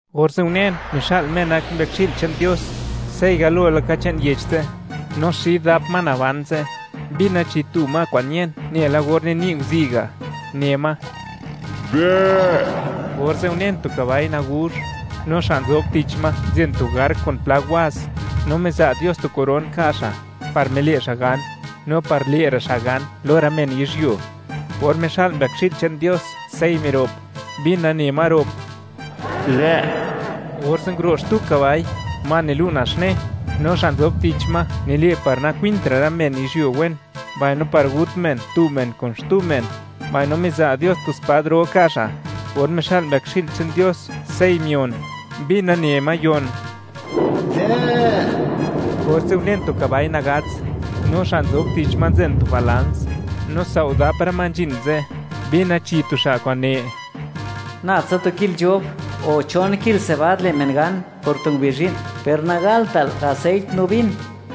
Orze' unen, mixa'l Me nak Mbëkxi'l che'n Dios, sey galo laka che'n yech ze', no xid dap ma naban ze', mbina chi tu ma kwa'n ñen nela or nini' nguzi' ga', ne ma: ―¡Dë'! Orze' unen tu kabai naguzh; no xa' nzob tich ma nzen tu ark kun pla waz, no miza' Dios tu koron nka' xa' par mile' xa' gan, no par le'ra' xa' gan lo rë men yizhyuo. Or mixa'l Mbëkxi'l che'n Dios sey mirop, mbina ne ma rop: ―¡Dë'! Orze' nguro' xtu kabai, ma nilu' naxne, no xa' nzob tich ma nile' par nakwintra' rë men yizhyuo wen, mbaino par gut men tu men kun xtu men; no miza' Dios tu spad ro ka' xa'. Or mixa'l Mbëkxi'l che'n Dios sey mion, mbina ne ma yon: ―¡Dë'! Orze' unen tu kabai nagats, no xa' nzob tich ma nzen tu balans, no sao' dap rë ma nzhin ze', mbina chi tu xa' kwa'n ne: ―Nabtsa tu kil nzhob, o chon kil sebad le' men gan por tu ngubizh zhi'n, per nagaltal aseit no vin.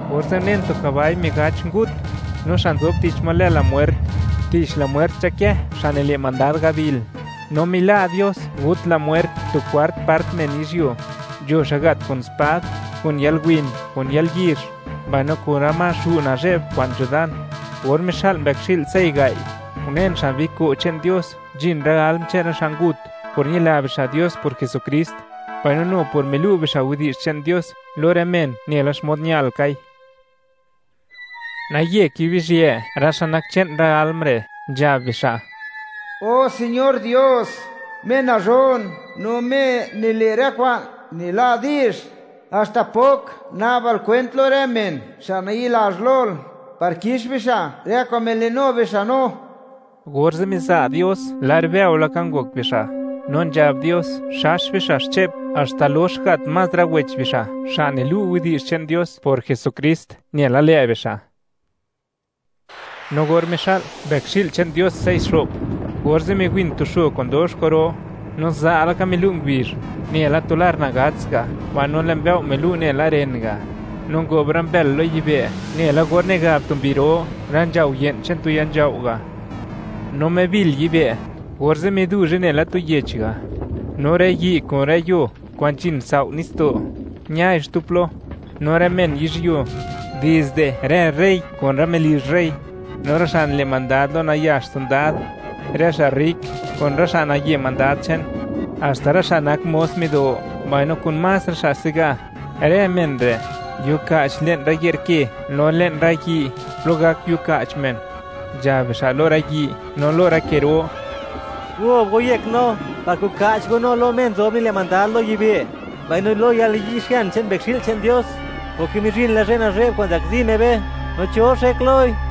Orze' unen tu kabai migach ngut, no xa' nzob tich ma lë La Mwert; tich La Mwert nzhakë xa' nile' mandad gabil, no mila' Dios gut La Mwert tu kwart part men yizhyuo; nzho xa' gat kun spad, kun yalwin, kun yalyizh, mbaino kun rë ma xu' nazhe'b kwa'n nzho dan. Or mixa'l Mbëkxi'l sey gai', unen xan biko' che'n Dios, nzhin rë alm che'n rë xa' ngut por ñila bixa' Dios por Jesukrist, no nu por milu' bixa' widi'zh che'n Dios lo rë men nela xmod ñalkai. Naye kibizhië rë xa' nak che'n rë alm re', nzhab bixa': ―O Señor Dios, Me nazhon no Me nile' rë kwa'n nila' di'zh, ¿haxta pok na'bal kwent lo rë men xa' nayi'lazh lol, par kix bixa' rë kwa'n milinu bixa' no? Orze' miza' Dios lar bëo laka ngok bixa', no nzhab Dios, le' bixa' diskans xche'p, haxta lox gat más rë wech bixa' xa' nilu' widi'zh che'n Dios por Jesukrist, nela lë' bixa'. No or mixa'l Mbëkxi'l che'n Dios sey xo'p, orze' miwin tu xo kwa'n dox kwa'ro, no za' laka milu' ngubizh, nela tu lar nagats ga', mbaino lë' mbëo' milu' nela ren ga'; no ngob rë mbël lo yibë', nela or nigab tu mbi ro rë nzhao' ye'n che'n tu ya nzhao' ga'; no mibil yibë', orze' miduzhe nela tu yech ga', no rë yi' kun rë yuo kwa'n nzhin sao' nitsdo', ñai xtu plo; no rë men yizhyuo, dizde rë rey kun rë melizh rey, no rë xa' nile' mandad lo nayax sondad, rë xa' rrik, kun rë xa' naye mandad che'n; haxta rë xa' nak mos mido mbaino kun más rë xa' se'ga; rë men re' nguiuka'ch le'n rë ye'r ke, no le'n rë yi' plo gak yiuka'ch men, nzhab bixa' lo rë yi' no lo rë ke ro: ―Gob go yek no, par koka'ch go no lo Me nzob nile' mandad lo yibë', mbaino lo yalniyi'xian che'n Mbëkxi'l che'n Dios, porke mizhin la zhë nazhe'b kwa'n zakzi Me be, ¿no cho xek loi?